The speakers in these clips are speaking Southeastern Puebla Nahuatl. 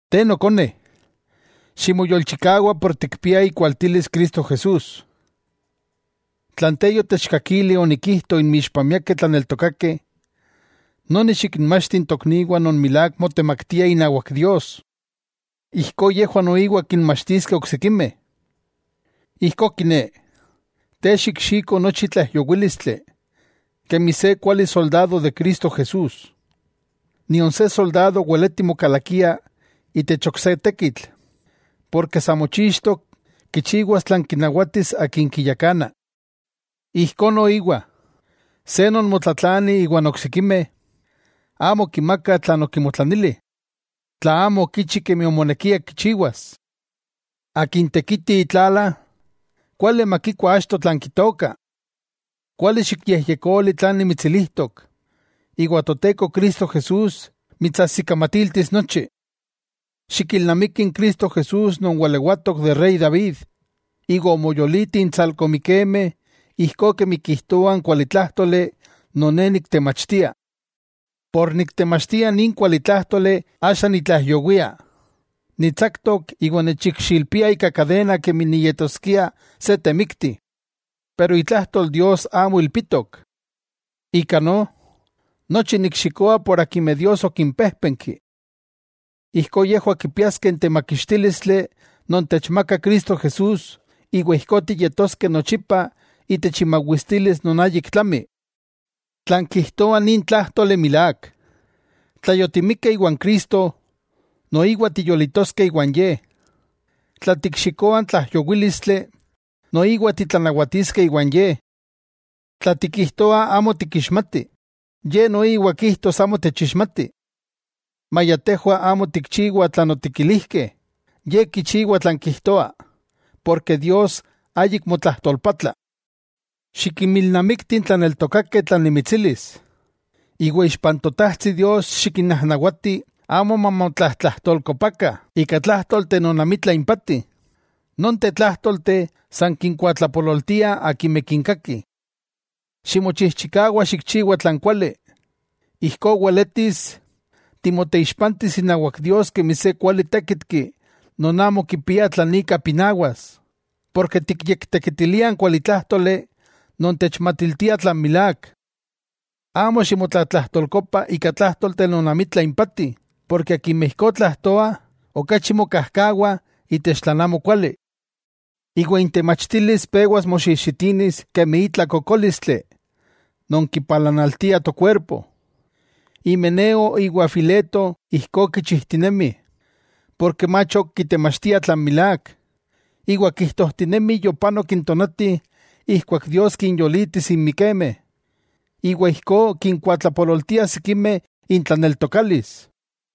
Te nokone, ximoyolchikawa por tikpiah ikualtilis Cristo Jesús. Tlan te yotechkakili onikijto inmixpah miakeh tlaneltokakeh, noni xikinmachti n tokniwah non milák motemaktiah inawak Dios, ijkó yejwah noiwa kinmachtiskeh oksikimeh. Ijkó kiné, te xikxiko nochi tlaijyowílistli, kemi se kuali soldado de Cristo Jesús. Nion se soldado weleti mokalakia itech ok se tekitl, porke sa mochixtok kichiwas tlan kinawatis akin kiyakana. Ijkó noiwa, se non motlatlani iwan oksikimeh, amo kimakah tlan okimotlanili, tla amo okichi kemi omonekia kichiwas. Akin tekiti itlala, kuali makikua achto tlan kitooka. Kuali xikyejyekoli tlan nimitsilijtok, iwa Toteko Cristo Jesús mitsajsikamatiltis nochi. Xikilnamiki n Cristo Jesús non walewatok de Rey David, iwa omoyoliti intsalko mikemeh ijkó kemi kijtoa n kualitlájtoli non ne niktemachtia. Por niktemachtia nin kualitlájtoli axa nitlaijyowia, nitsaktok iwa nechikxilpiah ika kadena kemi niyetoskia se temikti. Pero itlajtol Dios amo ilpitok. Ika no, nochi nikxikoa por akimeh Dios okimpéjpenki. Ijkó yejwah kipiaskeh n temakixtílistli non techmakah Cristo Jesús iwa ijkó tiyetoskeh nochipa itech imawistilis non ayik tlami. Tlan kijtoa nin tlájtoli milák: Tla yotimikeh iwan Cristo, noiwa tiyolitoskeh iwan Ye. Tla tikxikoah n tlaijyowílistli, noiwa titlanawatiskeh iwan Ye. Tla tikijtoah amo tikixmatih, Ye noiwa kijtos amo techixmati. Maya tejwah amo tikchiwah tlan otikilijkeh, Ye kichiwa tlan kijtoa, porke Dios ayik motlajtolpatla. Xikinmilnamikti n tlaneltokakeh tlan nimitsilis, iwa ixpa n Totajtsi Dios xikinnajnawati amo mamotlatlajtolkopakah ika tlájtolteh non amitla impati, nonteh tlájtolteh san kinkuatlapololtiah akimeh kinkakih. Ximochijchikawa xikchiwa tlan kuali, ijkó weletis timoyekixpantis inawak Dios kemi se kuali tékitki non amo kipia tlan ika pinawas, porke tikyektekitilia n kualitlájtoli non techmatiltia tlan milák. Amo ximotlatlajtolkopa ika tlájtolteh non amitla impati, porke akimeh ijkó tlajtoah okachi mokajkawah itech tlan amokuali, iwa intemachtilis pewas moxijxitinis kemi itla kokólistli non kipalanaltia tokuerpo. Himeneo iwa n Fileto ijkó kichijtinemih, porke mach ok kitemachtiah tlan milák, iwa kijtojtinemih yopanok n tonati ijkuak Dios kinyolitis n mikemeh, iwa ijkó kinkuatlapololtiah sikimeh intlaneltokalis.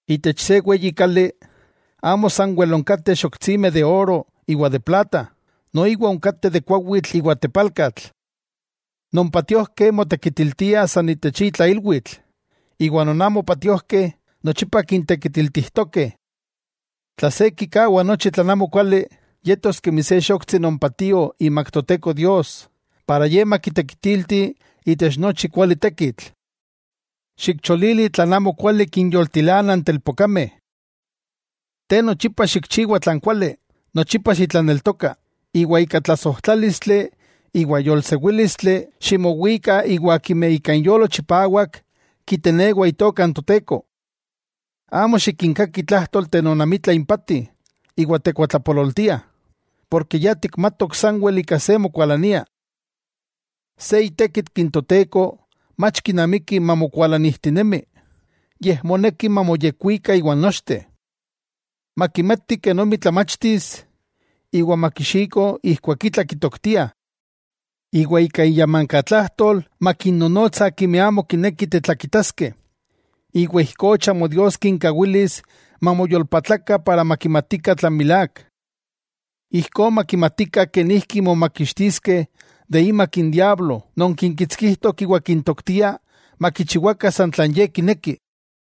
Itech se weyi kali, amo sanwel onkateh xoktsimeh de oro iwa plata, noiwa onkateh de kuawitl iwa tepalkatl. Non patiojkeh, motekitiltiah san itech itla ilwitl, iwa non amo patiojkeh, nochipa kintekitiltijtokeh. Yika, tla se kikawa nochi tlan amokuali, yetos kemi se xoktsi non patio imak Toteko Dios, Ye kitekitiltis itech nochi kuali tekitl. Xikcholili tlan amokuali kinyoltilana n telpokameh. Te nochipa xikchiwa tlan kuali, nochipa xitlaneltoka, iwa ika tlasojtlálistli iwa yolsewílistli ximowika iwa akimeh ika inyolo chipawak kitenewah itokah n Toteko. Amo xikinkaki tlájtolteh non amitla impati iwa tekuatlapololtia, porke ya tikmatok sanwel ika se mokualania. Se itékitki n Toteko mach kinamiki mamokualanijtinemi, yej moneki mamoyekwika iwan nochteh. Makimati kenomi tlamachtis iwa makixiko ijkuak itla kitoktiah. Iwa ika iyamankatlajtol makinnonotsa akimeh amo kinekih tetlakitaskeh, iwa ijkó chamo Dios kinkawilis mamoyolpatlakah para makimatikah tlan milák. Ijkó makimatikah kenijki momakixtiskeh de imak n diablo non kinkitskijtok iwa kintoktia makichiwakah san tlan ye kineki.